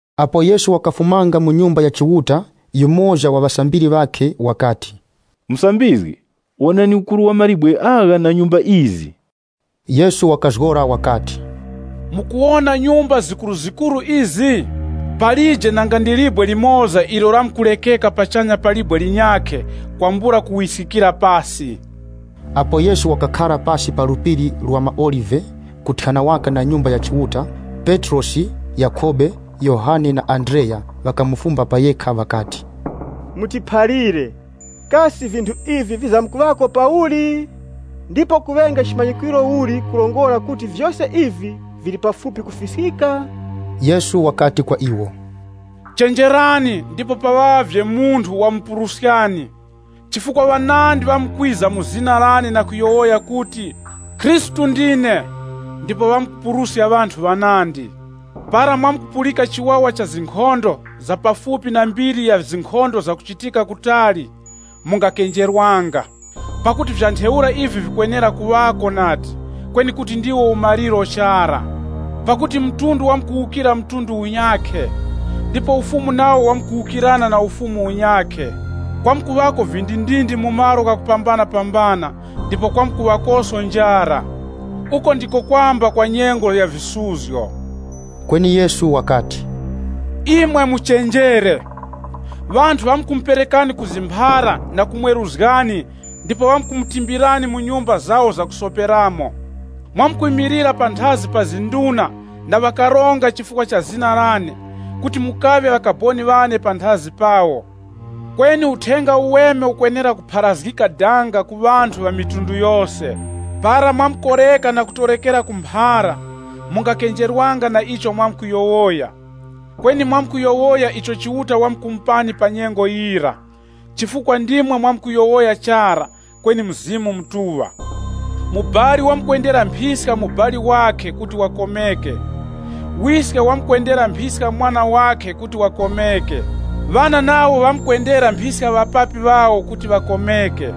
Apo Yesu wakafumanga mu Nyumba ya Chiuta, yumoza wa ŵasambiri ŵakhe wakati, “Musambizgi, wonani ukuru wa mawe agha na nyumba izi.” Yesu wakazgora wakati, “Mukuwona nyumba zikuruzikuru izi? Palije nanga ndi libwe limoza ilo lamkurekeka pachanya pa libwe linyakhe kwambula kuwiskikira pasi.” Apo Yesu wakakhara pasi pa Phiri la maOlive kuthyana waka na Nyumba ya Chiuta, Petrosi, Yakhobe, Yohane na Andreya ŵakamufumba pa yekha ŵakati, “Mutiphalire, kasi vinthu ivi vizamkuŵako pauli? Ndipo kuŵenge chimanyikwiro uli kurongora kuti vyose ivi vili pafupi kufiskika?” Yesu wakati kwa iwo, “Chenjerani ndipo paŵavye munthu wamupuruskani. Chifukwa ŵanandi ŵamkwiza mu zina lane na kuyowoya kuti, ‘Khristu ndine’ ndipo ŵamkupuruska ŵanthu ŵanandi. Para mwamkupulika chiwawa cha zinkhondo za pafupi na mbiri ya zinkhondo zakuchitika kutali, mungakenjerwanga. Pakuti vya ntheura ivi vikwenera kuŵako nadi, kweni kuti ndiwo umaliro chara. Pakuti mtundu wamkuwukira mtundu unyakhe, ndipo ufumu nawo wamkuwukirana na ufumu unyakhe. Kwamkuŵako vindindindi mu malo ghakupambanapambana ndipo kwamkuŵakoso njara. Uku ndiko kwamba kwa nyengo ya visuzgo.” Kweni Yesu wakati, Imwe muchenjere, ŵanthu ŵamkumuperekani ku zimphara na kumweruzgani ndipo ŵamkumutimbirani mu nyumba zawo zakusoperamo. Mwamkwimilira panthazi pa nduna na ŵakaronga chifukwa cha zina lane kuti mukaŵe ŵakaboni ŵane panthazi pawo. Kweni Uthenga Uweme ukwenera kupharazgika danga ku mafuko ghose. Para mwakoreka na kutorekera ku mphara, mungakenjerwanga na icho mwamkuyowoya. Kweni mwamkuyowoya icho Chiuta wamkumupani pa nyengo yira, chifukwa ndimwe mwamkuyowoya chara kweni Mzimu Mutuŵa. Mubali wamkwendera mphiska mubali wakhe kuti wakomeke, wiske wamkumwendera mphiska mwana wakhe kuti wakomeke. Ŵana nawo ŵamkwendera mphiska ŵapapi ŵawo kuti ŵakomeke.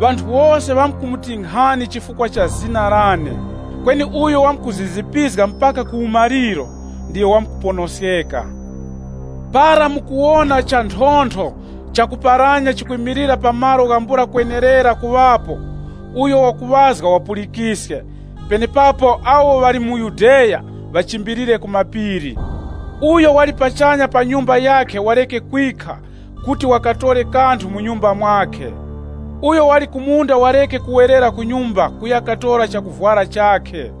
Ŵanthu wose ŵamkumutinkhani chifukwa cha zina lane. Kweni uyo wamkuzizipizga mpaka ku umaliro, ndiyo wamkuponoskeka. “Para mukuwona chanthontho chakuparanya chikwimilira pa malo ghambula kwenerera kuŵapo (uyo wakuŵazga wapulikiske), penepapo awo ŵali mu Yudeya ŵachimbilire ku mapiri. Uyo wali pachanya pa nyumba yakhe wareke kwikha kuti wakatore kanthu mu nyumba mwakhe. Uyo wali ku munda wareke kuwerera ku nyumba kuya katora chakuvwara chakhe.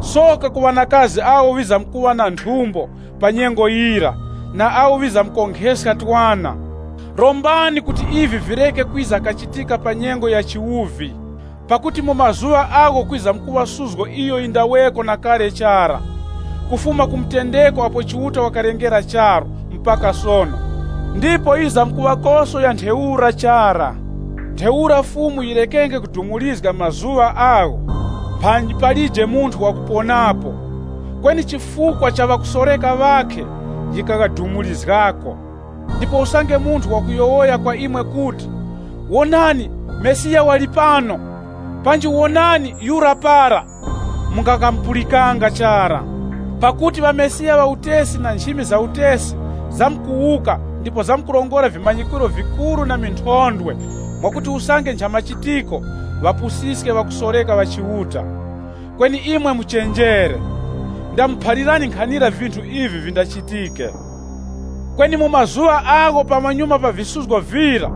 Soka ku ŵanakazi awo ŵizamkuŵa na nthumbo pa nyengo yira na awo ŵizamkonkheska twana! Rombani kuti ivi vireke kwiza kachitika pa nyengo ya chiwuvi. Pakuti mu mazuŵa agho kwizamkuŵa suzgo iyo yindaŵeko na kale chara, kufuma ku mutendeko apo Chiuta wakalengera charu, mpaka sono, ndipo yizamkuŵakoso ya ntheura chara. Ntheura Fumu yirekenge kudumurizga mazuŵa agho, mphanyi palije munthu wakuponapo. Kweni chifukwa cha ŵakusoreka ŵakhe yikaghadumurizgako. “Ndipo usange munthu wakuyowoya kwa imwe kuti, ‘Wonani, Mesiya wali pano!’ Panji, ‘Wonani, yura para!’ Mungakamupulikanga chara. Pakuti ŵamesiya ŵa utesi na nchimi za utesi zamkuwuka ndipo zamkurongora vimanyikwiro vikuru na minthondwe mwakuti usange nchamachitiko ŵapusiske ŵakusoreka ŵa Chiuta. Kweni imwe muchenjere. Ndamuphalirani nkhanira vinthu ivi vindachitike.” “Kweni mu mazuŵa agho pamanyuma pa visuzgo vira,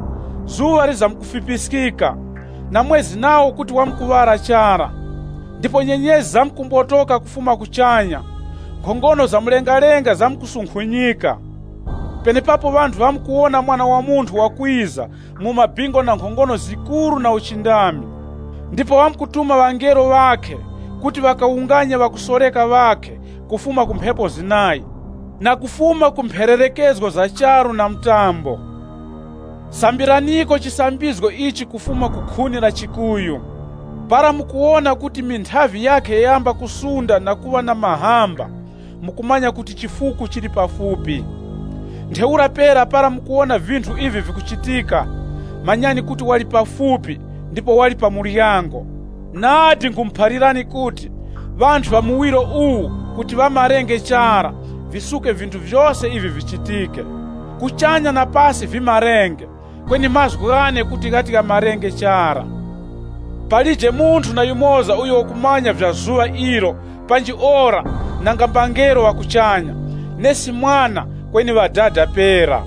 dazi lizamkufipiskika, na mwezi nawo kuti wamkuŵala chara. Ndipo nyenyezi zamkumbotoka kufuma kuchanya, nkhongono za mlengalenga zamkusunkhunyika! Penepapo ŵanthu ŵamkuwona Mwana wa Munthu wakwiza mu maŵingu na nkhongono zikuru na uchindami. Ndipo wamkutuma ŵangelo ŵakhe kuti ŵakawunganye ŵakusoreka ŵakhe kufuma ku mphepo zinayi, na kufuma ku mphererekezgo za charu na mtambo.” “Sambiraniko chisambizgo ichi kufuma ku khuni la chikuyu. Para mukuwona kuti minthavi yakhe yayamba kusunda na kuŵa na mahamba, mukumanya kuti chifuku chili pafupi. Ntheura pera, para mukuwona vinthu ivi vikuchitika, manyani kuti wali pafupi ndipo wali pa muryango. Nadi nkhumuphalirani kuti, ŵanthu ŵa muwiro uwu kuti ŵamarenge chara, visuke vinthu vyose ivi vichitike. Kuchanya na pasi vimarenge, kweni mazgu ghane kuti ghati ghamarenge chara.” “Palije munthu na yumoza uyo wakumanya vya zuŵa ilo panji ora nanga mbangelo ŵa kuchanya, nesi Mwana kweni Ŵadada pera.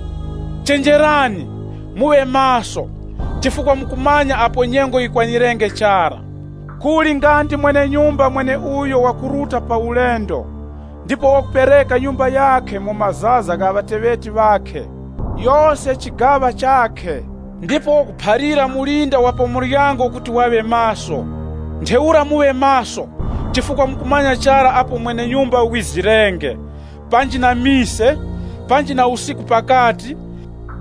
Chenjerani, muŵe maso, chifukwa mukumanya apo nyengo yikwanirenge chara. Kuli nga ndi mwene-nyumba mweneuyo wakuruta pa ulendo, ndipo wakupereka nyumba yakhe mu mazaza gha ŵateŵeti ŵakhe, yose chigaŵa chakhe, ndipo wakuphalira mulinda wa pa muryango kuti waŵe maso. Ntheura muŵe maso, chifukwa mukumanya chara apo mwene-nyumba wizirenge, panji na mise, panji na usiku pakati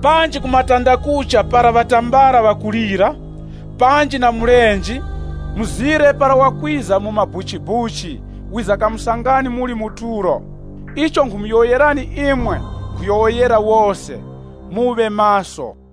panji ku matandakucha para ŵatambala ŵakulira, panji na mulenje, mzire para wakwiza mu mabuchibuchi, wizakamusangani muli mu tulo. Icho nkhumuyowoyerani imwe, nkhuyowoyera wose, ‘Muŵe maso.’”